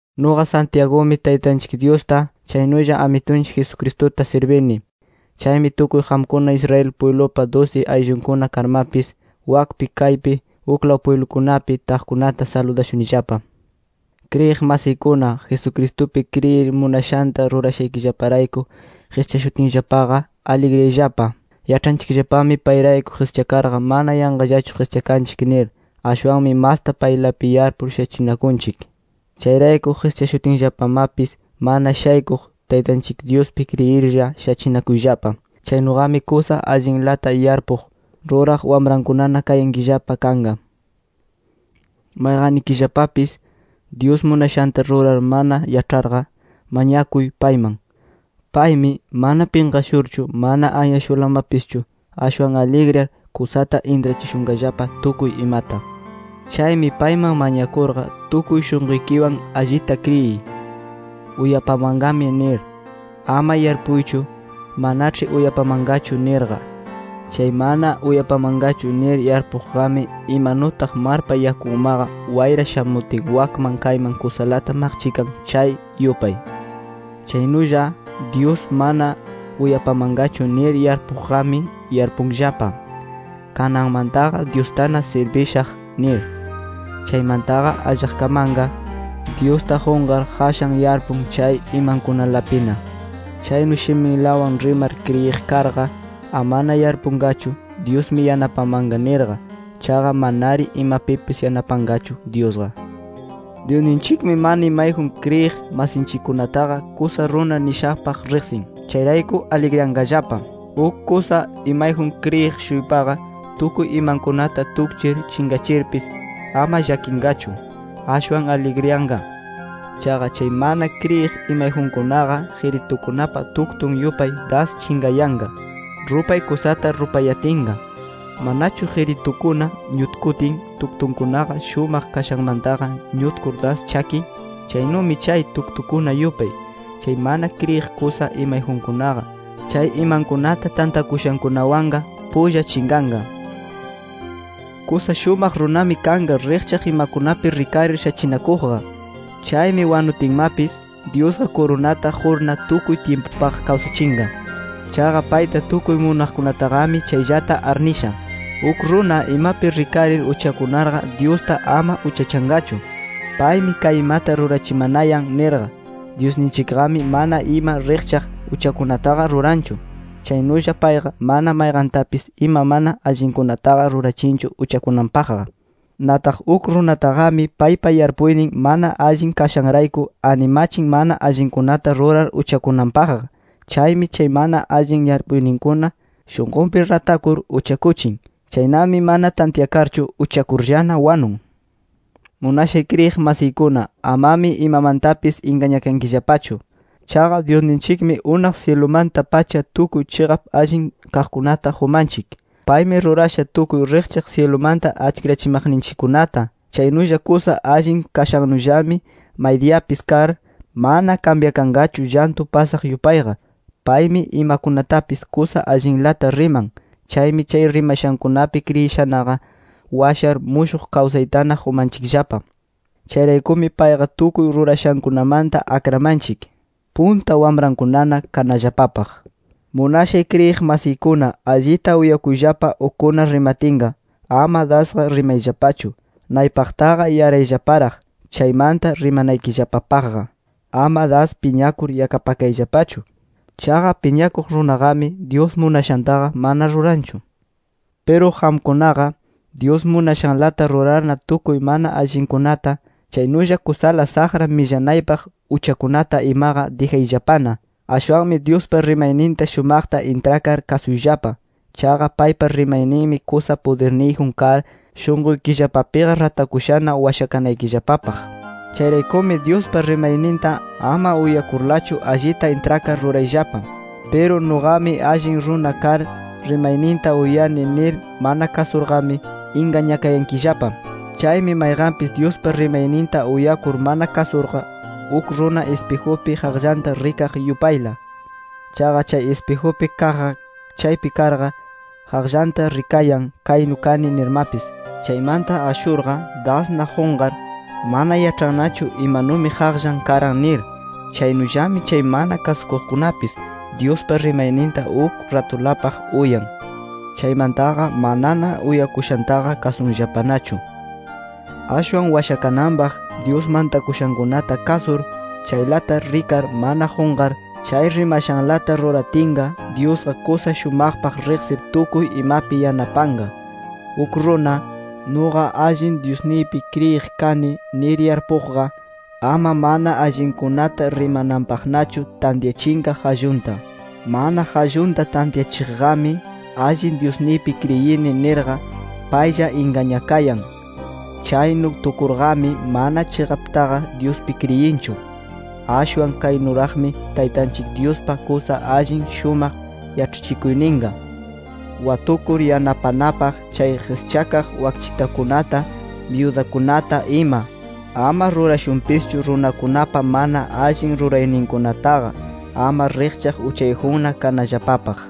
Nuqa Santiagumi Taytanchik Dyusta, chaynulla Amitunchik Jesucristuta sirbini. Chaymi tukuy qamkuna Israel pwiblupa dusi ayllunkuna karmapis, wakpi kaypi uklaw pwiblukunapi taqkunata saludashunillapa. Kriyiq masiykuna, Jesucristupi kriyir munashanta rurashaykillaparayku qischashutinllapaqa, aligriyayllapa. Yaĉhanchikllapami payrayku qischakarqa, mana yanqallachu qischakanchik nir. Ashwanmi masta paylapi yarpur shachinakunchik. Chayrayku qischashutinllapamapis mana shaykuq, Taytanchik Dyuspi kriyirlla shachinakuyllapa. Chaynuqami kusa allinlata yarpuq, ruraq wamrankunana kayankillapa kanqa. Mayqannikillapapis, Dyus munashanta rurar mana yaĉharqa, mañakuy payman. Paymi, mana pinqashurchu, mana anyashurlamapischu, ashwan aligriyar, kusata intrachishunqallapa tukuy imata. Chaymi payman mañakurqa, tukuy shunquykiwan allita kriyiy: Uyapamanqami nir. Ama yarpuychu: Manaĉhi uyapamanqachu nirqa. Chay mana uyapamanqachu nir yarpuqqami, imanutaq marpa yakunmaqa wayra shamutin wakman kayman kusalata maqchikan, chay yupay. Chaynulla, Dyus mana uyapamanqachu nir yarpuqqami yarpunllapa: Kananmantaqa Dyustana sirbishaq nir. Chaymantaqa allaqkamanqa, Dyusta qunqar, qashan yarpun chay imankunalapina. Chaynu shiminlawan rimar kriyiq karqa, amana yarpunqachu: Dyusmi yanapamanqa nirqa. Chaqa manari imapipis yanapanqachu Dyusqa. Dyusninchikmi mana imayjun kriyiq masinchikkunataqa, kusa runa nishapaq riqsin. Chayrayku aligriyanqallapa. Uk kusa imayjun kriyiq-shuypaqa, tukuy imankunata tukchir chinqachirpis, ama llakinqachu. Ashwan aligriyanqa. Chaqa chay mana kriyiq imayjunkunaqa, qiritukunapa tuktun yupay, das chinqayanqa. Rupay kusata rupayatinqa, ¿manachu qiritukuna ñutkutin, tuktunkunaqa shumaq kashanmantaqa ñutkur das chakin? Chaynumi chay tuktukuna yupay, chay mana kriyiq kusa imayjunkunaqa, chay imankunata tantakushankunawanqa, pulla chinqanqa. Kusa shumaq runami kanqa, riqchaq imakunapi rikarir shachinakuqqa. Chaymi wanutinmapis, Dyusqa kurunata qurna tukuy tyimpupaq kawsachinqa. Chaqa payta tukuy munaqkunataqami chayllata arnisha. Uk runa imapi rikarir uchakunarqa, Dyusta ama uchachanqachu: Paymi kay imata rurachimanayan nirqa. Dyusninchikqami mana ima riqchaq uchakunataqa ruranchu. Chaynulla payqa mana mayqantapis ima mana allinkunataqa rurachinchu uchakunanpaqqa. Nataq uk runataqami paypa yarpuynin mana allin kashanrayku, animachin mana allinkunata rurar uchakunanpaqqa. Chaymi chay mana allin yarpuyninkuna shunqunpi ratakur, uchakuchin. Chaynami mana tantyakarchu uchakurllana, wanun. Munashay kriyiq masiykuna, amami imamantapis ingañakankillapachu. Chaqa Dyusninchikmi unaq syilumanta-pacha tukuy chiqap allin kaqkunata qumanchik. Paymi rurasha tukuy riqchaq syilumanta achkirachimaqninchikkunata. Chaynulla kusa allin kashannullami maydiyapis kar, mana kambyakanqachu llantu pasaq yupayqa. Paymi imakunatapis kusa allinlata riman. Chaymi chay rimashankunapi kriyishanaqa, washar mushuq kawsaytana qumanchikllapa. Chayraykumi payqa tukuy rurashankunamanta akramanchik, punta wamrankunana kanallapapaq. Munashay kriyiq masiykuna, allita uyakuyllapa ukkuna rimatinqa. Ama dasqa rimayllapachu. Naypaqtaqa yarayllaparaq, chaymanta rimanaykillapapaqqa. Ama das piñakur yakapakayllapachu. Chaqa piñakuq runaqami, Dyus munashantaqa mana ruranchu. Piru qamkunaqa, Dyus munashanlata rurarna tukuy mana allinkunata, chaynulla kusala saqra millanaypaq uchakunata imaqa dijayllapana. Ashwanmi Dyuspa rimayninta shumaqta intrakar kasuyllapa. Chaqa paypa rimayninmi kusa pudirniyjun kar, shunquykillapapiqa ratakushana washakanaykillapapaq. Chayraykumi Dyuspa rimayninta, ama uyakurlachu allita intrakar rurayllapa. Piru “Nuqami allin runa kar, rimayninta uyani” nir mana kasurqami, ingañakayankillapa. Chaymi mayqanpis Dyuspa rimayninta uyakur mana kasurqa, uk runa ispijupi qaqllanta rikaq yupayla. Chaqa chay ispijupi kaqqa chaypi karqa, qaqllanta rikayan “Kaynu kani” nirmapis. Chaymanta ashurqa, dasna qunqar, mana yaĉhannachu imanumi qaqllan karan nir. Chaynullami chay mana kasukuqkunapis, Dyuspa rimayninta uk ratulapaq uyan. Chaymantaqa manana uyakushantaqa kasunllapanachu. Ashwan washakananpaq, Dyus mantakushankunata kasur, chaylata rikar mana qunqar, chay rimashanlata ruratinqa, Dyusqa kusa shumaqpaq riqsir tukuy imapi yanapanqa. Uk runa, “Nuqa allin Dyusniypi kriyiq kani” nir yarpuqqa, ama mana allinkunata rimananpaqnachu tantyachinqa qallunta. Mana qallunta tantyachiqqami: “Allin Dyusniypi kriyini” nirqa, paylla ingañakayan. Chaynu tukurqami mana chiqaptaqa Dyuspi kriyinchu. Ashwan kaynuraqmi Taytanchik Dyuspa kusa allin shumaq yaĉhachikuyninqa: Watukur yanapanapaq chay qischakaq wakchitakunata, byudakunata, ima. Ama rurashunpischu runakunapa mana allin rurayninkunataqa, ama riqchaq uchayjunna kanallapapaq.